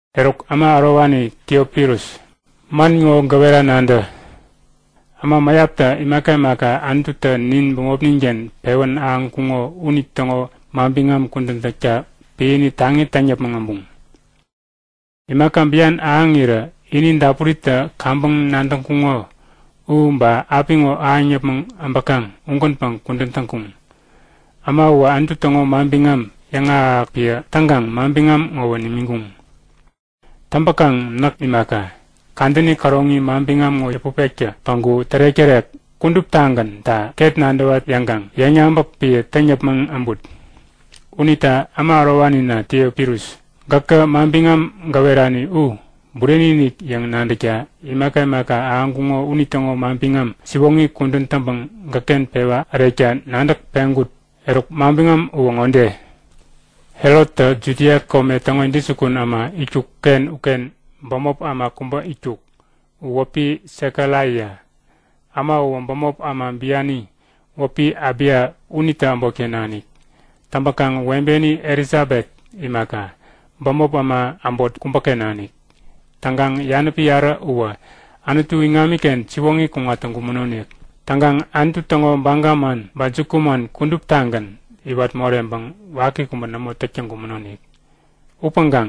Eruk, äma ärowani Tiofilus, man ŋo gäwera nadä; Äma mäyaptä imaka imaka Anututä nin bämopnin-ken pewän ahäŋkuŋo unitäŋo manbiŋam kudän täkta piäni taŋi täŋ yäpmäŋ äbuŋ. Imaka bian ahäŋirä ini dapuritä kaŋpäŋ nadäŋkuŋo u ba apiŋo ahäŋ yäpmäŋ abäkaŋ ugänpäŋ kudän täŋkuŋ. Äma uwä Anutu täŋo manbiŋam yäŋahäk-ahäk piä täŋkaŋ manbiŋam ŋowä nimiŋkuŋ. Täŋpäkaŋ näk imaka, kadäni käroŋi manbiŋam ŋo yäput pektä päŋku tärek-tärek u kuduptagänta ket nadäwa yäŋkaŋ yäŋyabäk piä täŋ yäpmäŋ abut. Unita äma ärowanina Tiofilus, gäkä manbiŋam gäwerani u bureni-inik yäŋ nadäkta imaka imaka ahäŋkuŋo unitäŋo manbiŋam siwoŋi kudän täŋpäŋ gäkken pewa ärekta nadäk peŋkut. Eruk manbiŋam uwä ŋode; Herottä Judia kome täŋo intäjukun äma itkuk-ken uken bämop äma kubä itkuk, u wäpi Sekaraia. Äma uwä bämop äma biani wäpi Abiya unitä äbotken nanik. Täŋpäkaŋ webeni Elisabet imaka, bämop äma äbot kubäken nanik. Täŋkaŋ yanäpi yarä uwä Anutu iŋamiken siwoŋi kuŋat täŋkumänonik. Täŋkaŋ Anutu täŋo baga man ba jukuman kuduptagän iwat moreŋpäŋ waki kubä nämo täk täŋkumänonik. Upäŋkaŋ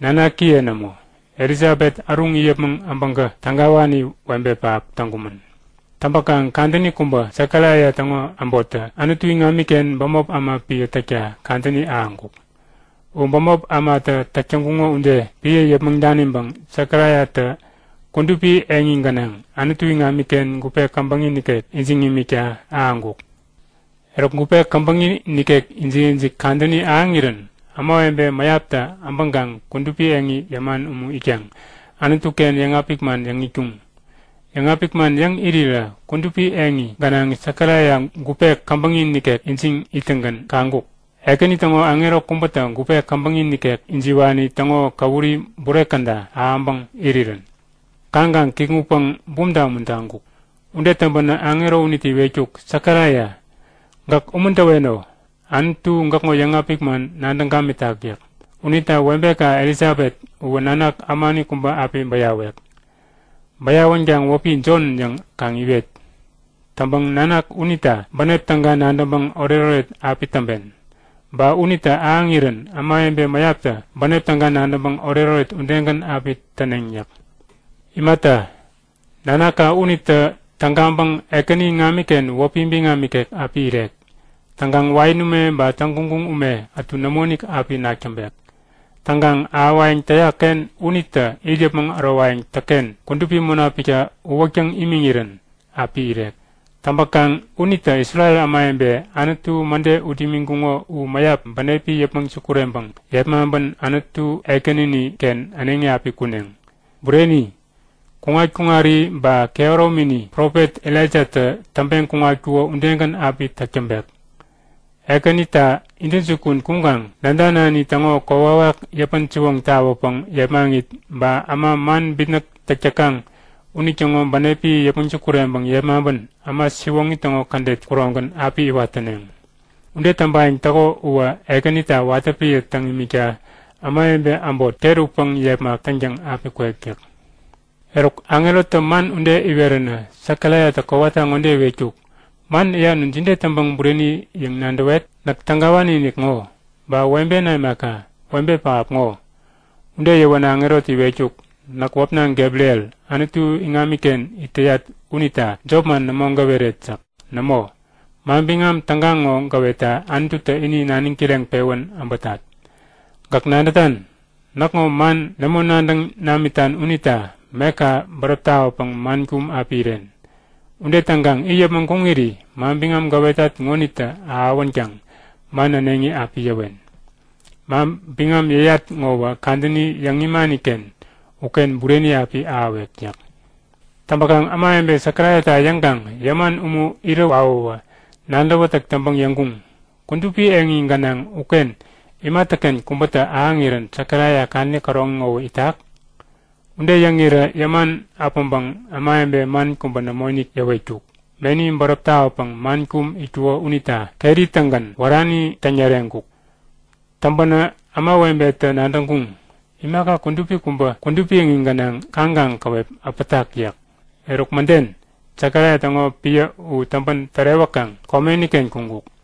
nanakiye nämo. Elisabet äruŋ it yäpmäŋ äbäŋkä tägawani webe pähap täŋkumän. Täŋpäkaŋ kadäni kubä, Sekaraia täŋo äbottä Anutu iŋamiken bämop äma piä täkta kadäni ahäŋkuk. U bämop ämatä täk täŋkuŋo ude piä yäpmäŋ daniŋpäŋ Sekaraiatä kudupi eŋi gänaŋ Anutu iŋamiken gupe käbäŋi nikek ijiŋ imikta ahäŋkuk. Eruk, gupe käbäŋi nikek ijik-ijik kadäni ahäŋirän ämawebe mäyaptä äbäŋkaŋ kudupi eŋi yämän umu itkaŋ Anutu-ken yäŋapik man yäŋ itkuŋ. Yäŋapik man yäŋ irirä kudupi eŋi gänaŋ Sekaraia gupe käbäŋi nikek ijiŋ ittäŋgän kaŋkuk; Ekäni täŋo aŋero kubätä gupe käbäŋi nikek ijiwani täŋo käwuri bure käda ahäŋpäŋ irirän. Kaŋkaŋ kikŋutpäŋ bumta umuntaŋkuk. Ude täŋpänä aŋero unitä iwetkuk; Sekaraia, gäk umuntäweno. Anutu gäkŋo yäŋapik man nadäŋ gamitak yäk. Unita webeka Elisabet uwä nanak ämani kubä api bäyawek. Bäyawänkaŋ wäpi Jon yäŋ, kaŋ iwet. Täŋpäŋ nanak unita bänep täga nadäŋpäŋ oretoret api täŋpen. Ba unitä ahäŋirän ämawebe mäyaptä bänep täga nadäŋpäŋ oretoret udegän api täneŋ yäk. Imata, nanaka unitä tägaŋpäŋ Ekäni iŋamiken wäpi biŋam ikek api irek. Täŋkaŋ wain ume ba täŋguŋguŋ ume ätu nämoinik api nak täŋpek. Täŋkaŋ ahäwayäŋ täyak-ken unitä it yäpmäŋ ärowayäŋ täkken Kudupi Munapiktä uwäktäŋ imiŋirän api irek. Täŋpäkaŋ unitä Isrel ämawebe Anutu mäde ut imiŋkuŋo u mäyap bänepi yäpmäŋ sukureŋpäŋ yepmaŋpän Anutu Ekänini-ken äneŋi api kuneŋ. Bureni, kuŋat-kuŋari ba kehäromini Profet Elaijatä täŋpeŋ kuŋatkuko udegän api täk täŋpek. Ekänita intäjukun kuŋkaŋ nädanani täŋo kokwawak yäpän-siwoŋ tawäpäŋ yepmaŋit, ba äma man bitnäk täk täkaŋ unitäŋo bänepi yäpmäŋ sukureŋpäŋ yepmaŋpän äma siwoŋi täŋo kädet kuroŋgän api iwat täneŋ. Ude täŋpayäŋ täko uwä Ekänita watä piä täŋ imikta ämawebe äbot ket utpäŋ yepmak täŋtäŋ api kwek yäk. Eruk, aŋerotä man ude iweränä, Sekaraiatä kowata ŋode iwetkuk; Man yäyan u jide täŋpäŋ bureni yäŋ nadäwet? Näk tägawani-inik ŋo, ba webena imaka, webe pähap ŋo! Ude yäwänä aŋerotä iwetkuk; Näk wäpna Gebriel, Anutu iŋamiken it täyat unita jopman nämo gäweret yäk. Nämo, manbiŋam täga ŋo gäwetta Anututä ini naniŋ kireŋpewän äbätat. Gäk nadätan? Näkŋo man nämo nadäŋ namitan unita meka bäräp tawäpäŋ man kum api iren. Ude täŋkaŋ it yäpmäŋ kuŋiri manbiŋam gäwetat ŋonitä ahäwänkaŋ man äneŋi api yäwen. Manbiŋam yäyat ŋowä kadäni yäŋ imani-ken uken bureni api ahäwek yäk. Täŋpäkaŋ ämawebe Sekaraiata yäŋkaŋ yäman umu irä wawäwä nadäwätäk täŋpäŋ yäŋkuŋ; Kudupi eŋi gänaŋ uken imatäken kubätä ahäŋirän Sekaraia kadäni käroŋi ŋowä itak? Ude yäŋirä yäman äpäŋpäŋ ämawebe man kubä nämoinik yäwetkuk. Meni bäräp tawäpäŋ man kum itkuko unita keri-tägän wärani täŋyäreŋkuk. Täŋpänä ämawebetä nadäŋkuŋ; Imaka kudupi kubä kudupi eŋi gänaŋ kaŋkaŋ käwep äpätak yäk. Eruk mäden, Sekaraia täŋo piä u täŋpän tärewäkaŋ komeni-ken kuŋkuk.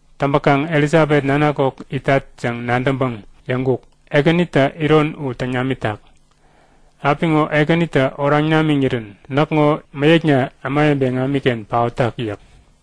Täŋpäkaŋ Elisabet nanak kok itat yäŋ nadäŋpäŋ yäŋkuk; Ekänitä iron u täŋ namitak! Apiŋo Ekänitä oraŋ namiŋirän näkŋo mäyäkna ämawebe iŋamiken paotak yäk.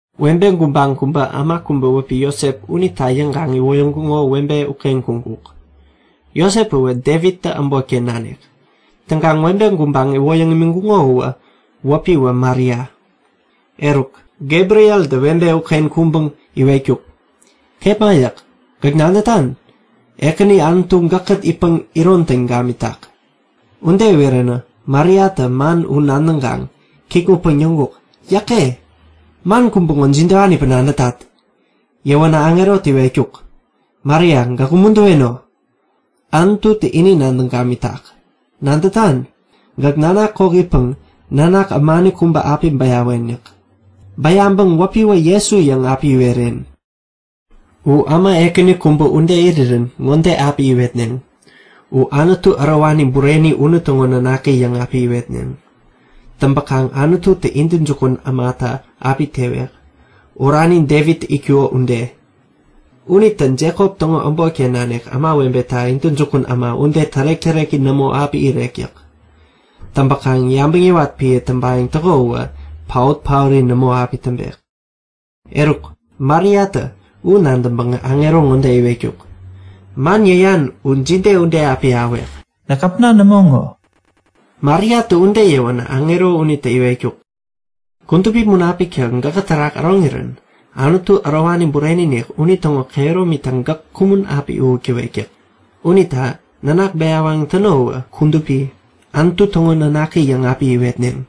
Webe gubaŋ kubä äma kubä wäpi Josep unita yäŋkaŋ iwoyäŋkuŋo webe uken kuŋkuk. Josep uwä Devittä äbotken nanik. Täŋkaŋ webe gubaŋ iwoyäŋ imiŋkuŋo u wäpiwä Maria. Eruk, Gebrieltä webe uken kuŋpäŋ iwetkuk; Kepma yäk. Gäk nadätan? Ekäni Anutu gäkkät itpäŋ iron täŋ gamitak. Ude iweränä Mariatä man u nadäŋkaŋ kikŋutpäŋ yäŋkuk; Yäke! Man kubä ŋo jidewanipäŋ nadätat? Yäwänä aŋerotä iwetkuk; Maria, gäk umuntäweno! Anututä ini nadäŋ gamitak. Nadätan? Gäk nanak kok itpäŋ nanak ämani kubä api bäyawen yäk. Bäyaŋpäŋ wäpiwä Jesu yäŋ api iweren. U äma ekäni kubä ude irirän ŋode api iwetneŋ; U Anutu Ärowani Bureni unitäŋo Nanaki yäŋ api iwetneŋ. Täŋpäkaŋ Anututä intäjukun ämata api tewek, orani Devittä itkuko ude. Unitä Jekop täŋo äbotken nanik ämawebeta intäjukun äma ude tärek-täreki nämo api irek yäk. Täŋpäkaŋ yabäŋ yäwat piä täŋpayäŋ täko uwä paot-paori nämo api täŋpek. Eruk, Mariatä u nadäŋpäŋä aŋero ŋode iwetkuk; Man yäyan u jide ude api ahäwek? Näk äpna nämo ŋo! Mariatä ude yäwänä aŋero unitä iwetkuk; Kudupi Munapiktä gäkä terak äroŋirän Anutu Ärowani Bureni-inik unitäŋo kehärominitä gäk kumän api uwäk täwek yäk. Unita nanak kudupi bäyawayäŋ täno uwä Anutu täŋo Nanaki yäŋ api iwetneŋ.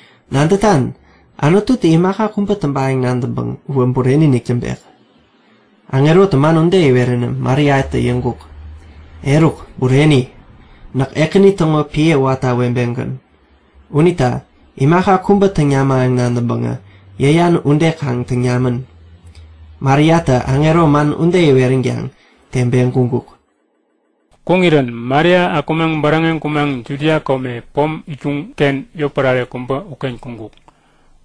Nadätan? Anututä imaka kubä täŋpayäŋ nadäŋpäŋ uwä bureni-inik täŋpek. Aŋerotä man ude iweränä Mariatä yäŋkuk; Eruk, bureni! Näk Ekäni täŋo piä watä webegän. Unita imaka kubä täŋ namayäŋ nadäŋpäŋä, yäyan ude kaŋ täŋ namän. Mariatä aŋero man ude iweränkaŋ teŋpeŋ kuŋkuk. Kuŋirän Maria akumaŋ bäräŋeŋ kumaŋ Judia kome pom itkuŋ-ken yotpärare kubä uken kuŋkuk.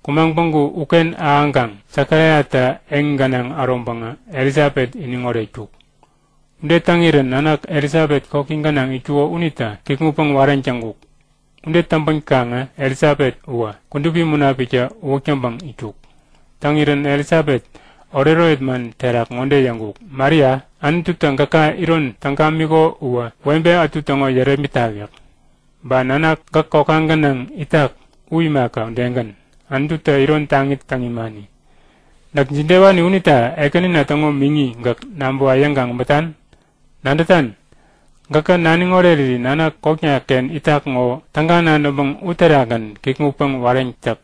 Kumaŋ päŋku uken ahäŋkaŋ Sekaraiatä eŋi gänaŋ äroŋpäŋä Elisabet iniŋ oretkuk. Ude täŋirän nanak Elisabet koki gänaŋ itkuko unitä kikŋutpäŋ wareŋ täŋkuk. Ude täŋpänkaŋä Elisabet uwä Kudupi Munapiktä uwäk täŋpäŋ itkuk. Täŋirän Elisabet oretoret man terak ŋode yäŋkuk; Maria! Anututä gäka iron täŋ gamiko uwä webe ätu täŋo yärepmitak yäk. Ba nanak gäk kokka gänaŋ itak u imaka udegän, Anututä iron taŋi täŋ imani. Näk jidewani unita Ekänina täŋo miŋi gäk nabäwa yäŋkaŋ äbätan? Nadätan? Gäkä naniŋ oreriri nanak kokna-ken itak ŋo täga nadäŋpäŋ uterakgän kikŋutpäŋ wareŋ täk!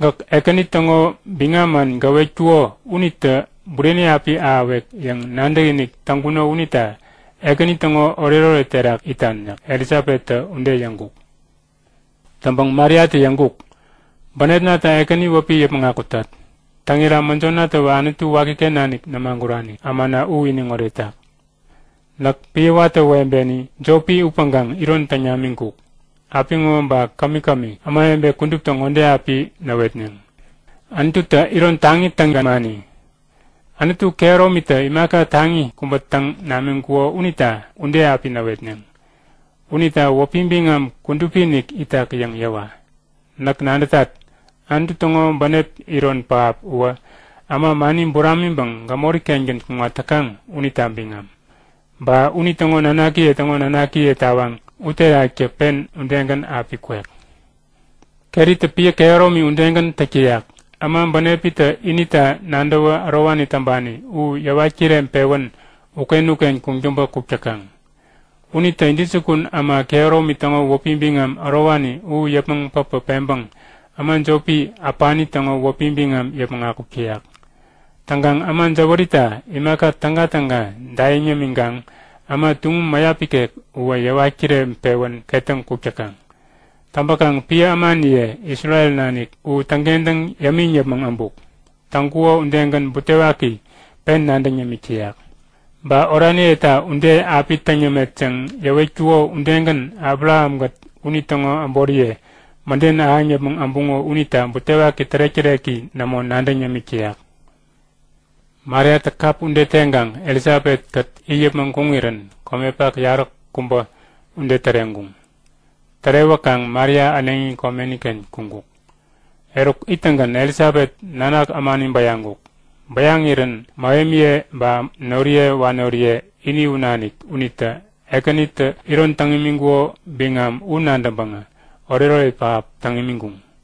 Gäk Ekäni täŋo biŋam man gäwetkuko unitä bureni api ahäwek yäŋ nadäkinik täŋkuno unita Ekäni täŋo oretoret terak itan yäk. Elisabettä ude yäŋkuk. Täŋpäŋ Mariatä yäŋkuk; Bänepnatä Ekäni wäpi yäpmäŋ akutat! Täŋira mäjonatäwä Anutu wakiken nanik nämagurani ämana u iniŋ oretak. Näk piä watä webeni jopi upäŋkaŋ iron täŋ namiŋkuk. Apiŋo ba kämi-kämi ämawebe kuduptä ŋode api näwetneŋ; Anututä iron taŋi täŋ gamani. Anutu Kehäromitä imaka taŋi kubä täŋ namiŋkuko unita ude api näwetneŋ. Unita wäpi biŋam kudupi-inik itak yäŋ yäwa! Näk nadätat, Anutu täŋo bänep iron pähap uwä äma mani buramiŋpäŋ gämori-kengän kuŋat täkaŋ unita biŋam. Ba unitäŋo nanakiye täŋo nanakiye tawaŋ uteraktä pen udegän api kwek. Keritä piä kehäromi udegän täk täyak. Äma bänepitä inita nadäwä ärowani täŋpani u yäwat kireŋpewän uken-uken kuŋtäŋpä kuk täkaŋ. Unitä intäjukun äma kehäromi täŋo wäpi biŋam ärowani u yäpmäŋ päpä peŋpäŋ äma jopi äpani täŋo wäpi biŋam yäpmäŋ akuk täyak. Täŋkaŋ äma jäwärita imaka tägatäga daiŋ yämiŋkaŋ äma tuŋum mäyap ikek uwä yäwat kireŋpewän ketäŋ kuk täkaŋ. Täŋpäkaŋ piä ämaniye Isrel nanik u täŋkentäŋ yämiŋ yäpmäŋ äbuk. Täŋkuko udegän butewaki pen nadäŋ yämik täyak. Ba oraniyeta ude api täŋ yämet yäŋ yäwetkuko udegän Abrahamkät unitäŋo äboriye mäden ahäŋ yäpmäŋ äbuŋo unita butewaki tärek-täreki nämo nadäŋ yämik täyak. Mariatä kap ude teŋkaŋ Elisabet-kät it yäpmäŋ kuŋirän komepak yaräkubä ude täreŋkuŋ. Tärewäkaŋ Maria äneŋi komeni-ken kuŋkuk. Eruk ittäŋgän Elisabet nanak ämani bäyaŋkuk. Bäyaŋirän mähemiye ba noriye wanoriye ini u nanik unitä Ekänitä iron täŋ imiŋkuko biŋam u nadäŋpäŋä oretoret pähap täŋ imiŋkuŋ.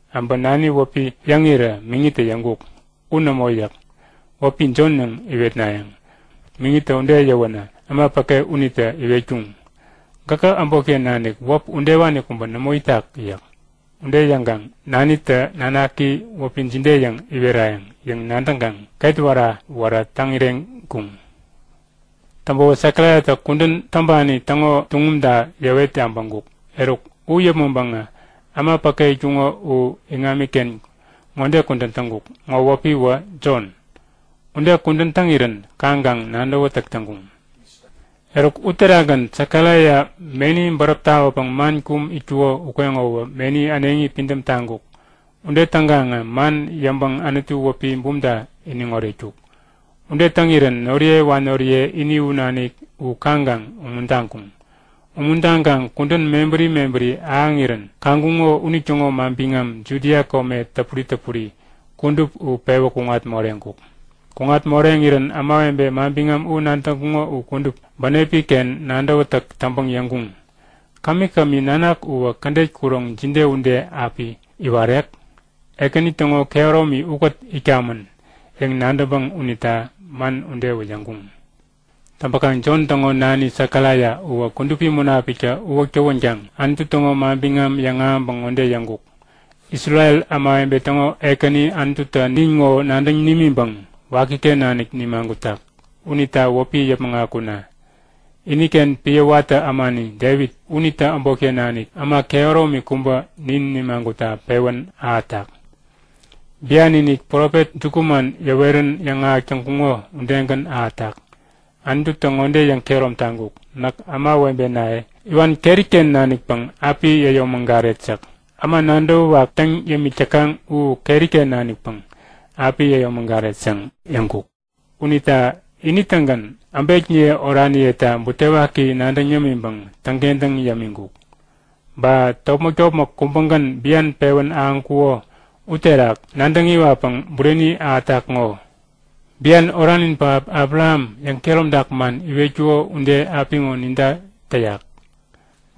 Äbä nani wäpi yäŋirä miŋitä yäŋkuk; U nämo yäk. Wäpi Jon yäŋ iwetnayäŋ. Miŋitä ude yäwänä äma päke unitä iwetkuŋ; Gäkä äbotken nanik wäp udewani kubä nämo itak yäk. Ude yäŋkaŋ nanitä nanaki wäpi jide yäŋ iwerayäŋ yäŋ nadäŋkaŋ ketwära-wära täŋireŋkuŋ. Täŋpäwä Sekaraiatä kudän täŋpani täŋo tuŋumta yäwet yabäŋkuk. Eruk, u yäpmäŋpäŋä äma päke itkuŋo u iŋamiken ŋode kudän täŋkuk; Ŋo wäpiwä Jon. Ude kudän täŋirän kaŋkaŋ nadäwätäk täŋkuŋ. Eruk, uterakgän Sekaraia meni bäräp tawäpäŋ man kum itkuko ukeŋowä meni äneŋi pidäm taŋkuk. Ude täŋkaŋä man yäŋpäŋ Anutu wäpi bumta iniŋ oretkuk. Ude täŋirän noriye wanoriye ini u nanik u kaŋkaŋ umuntaŋkuŋ. Umuntaŋkaŋ kudän mebäri mebäri ahäŋirän kaŋkuŋo unitäŋo manbiŋam Judia kome täpuri täpuri kudup u pewä kuŋat moreŋkuk. Kuŋat moreŋirän ämawebe manbiŋam u nadäŋkuŋo u kudup bänepi-ken nadäwätäk täŋpäŋ yäŋkuŋ; Kämi-kämi nanak uwä kädet kuroŋ jide ude api iwarek? Ekäni täŋo kehäromi ukät itkamän yäŋ nadäŋpäŋ unita man udewä yäŋkuŋ. Täŋpäkaŋ Jon täŋo nani Sekaraia uwä Kudupi Munapiktä uwäk tawänkaŋ Anutu täŋo manbiŋam yäŋahäŋpäŋ ŋode yäŋkuk; Isrel ämawebe täŋo Ekäni Anututä nin ŋo nadäŋ nimiŋpäŋ wakiken nanik nimagutak. Unita wäpi yäpmäŋ akuna! Iniken piä watä ämani Devit, unitä äbotken nanik äma kehäromi kubä nin nimagutta pewän ahätak. Bian-inik profet jukuman yäwerän yäŋahäk täŋkuŋo udegän ahätak. Anututä ŋode yäŋkehärom taŋkuk; Näk ämawebenaye iwan keri-ken nanikpäŋ api yäyomägaret yäk. Äma nadäwäwak täŋ yämik täkaŋ u keri-ken nanikpäŋ api yäyomägaret yäŋ yäŋkuk. Unita ini-tägän äbekniye oraniyeta butewaki nadäŋ yämiŋpäŋ täŋkentäŋ yämiŋkuk. Ba topmäk-topmäk kubägän bian pewän ahäŋkuko uterak nadäŋ iwatpäŋ bureni ahätak ŋo. Bian oranin pähap Abraham yäŋkehäromtak man iwetkuko ude apiŋo ninta täyak.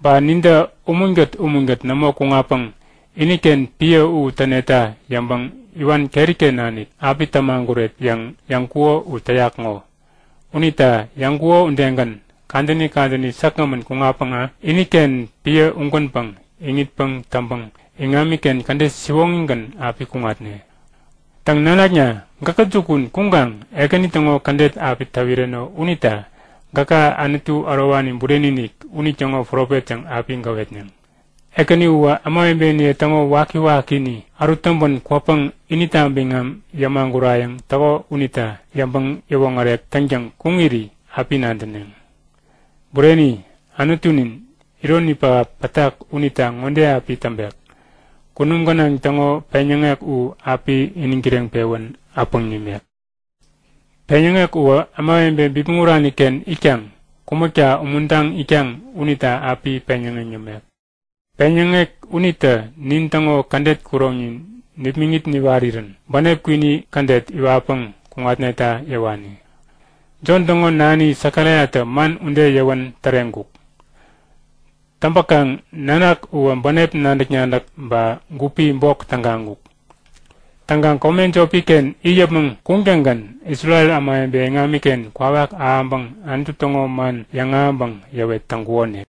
Ba nintä umunkät umunkät nämo kuŋatpäŋ iniken piä u täneta yäŋpäŋ iwan keri-ken nanik api tämaguret yäŋ yäŋkuko u täyak ŋo. Unita yäŋkuko udegän, kadäni kadäni säkgämän kuŋatpäŋä iniken piä ugänpäŋ iŋitpäŋ täŋpäŋ iŋamiken kädet siwoŋigän api kuŋatne. Täŋ, nanakna, gäkä jukun kuŋkaŋ Ekäni täŋo kädet api täwireno unita gäka Anutu Ärowani Bureni-inik unitäŋo profet yäŋ api gäwetneŋ. Ekäni uwä ämawebeniye täŋo waki-wakini ärut täŋpän kwäpäŋ inita biŋam yämagurayäŋ täko unita yäŋpäŋ-yäwoŋärek täŋtäŋ kuŋiri api nadäneŋ. Bureni! Anutunin, ironi pähap pätak unita ŋode api täŋpek; Kunum gänaŋ täŋo peŋyäŋek u api iniŋ kireŋpewän äpäŋ nimek. Peŋyäŋek uwä ämawebe bipmäŋ urani-ken itkaŋ kumäkta umuntaŋ itkaŋ unita api peŋyäŋeŋ yämek. Peŋyäŋek unitä nintäŋo kädet kuroŋnin nipmäŋit niwarirän bänep kwini kädet iwatpäŋ kuŋatneta yäwani. Jon täŋo nani Sekaraiatä man ude yäwän täreŋkuk. Täŋpäkaŋ nanak uwä bänep nadäk-nadäk ba gupi bok tägaŋkuk. Täŋkaŋ kome jopi-ken it yäpmäŋ kuŋtäŋgän Isrel ämawebe iŋamiken kwawak ahäŋpäŋ Anutu täŋo man yäŋahäŋpäŋ yäwet täŋkukonik.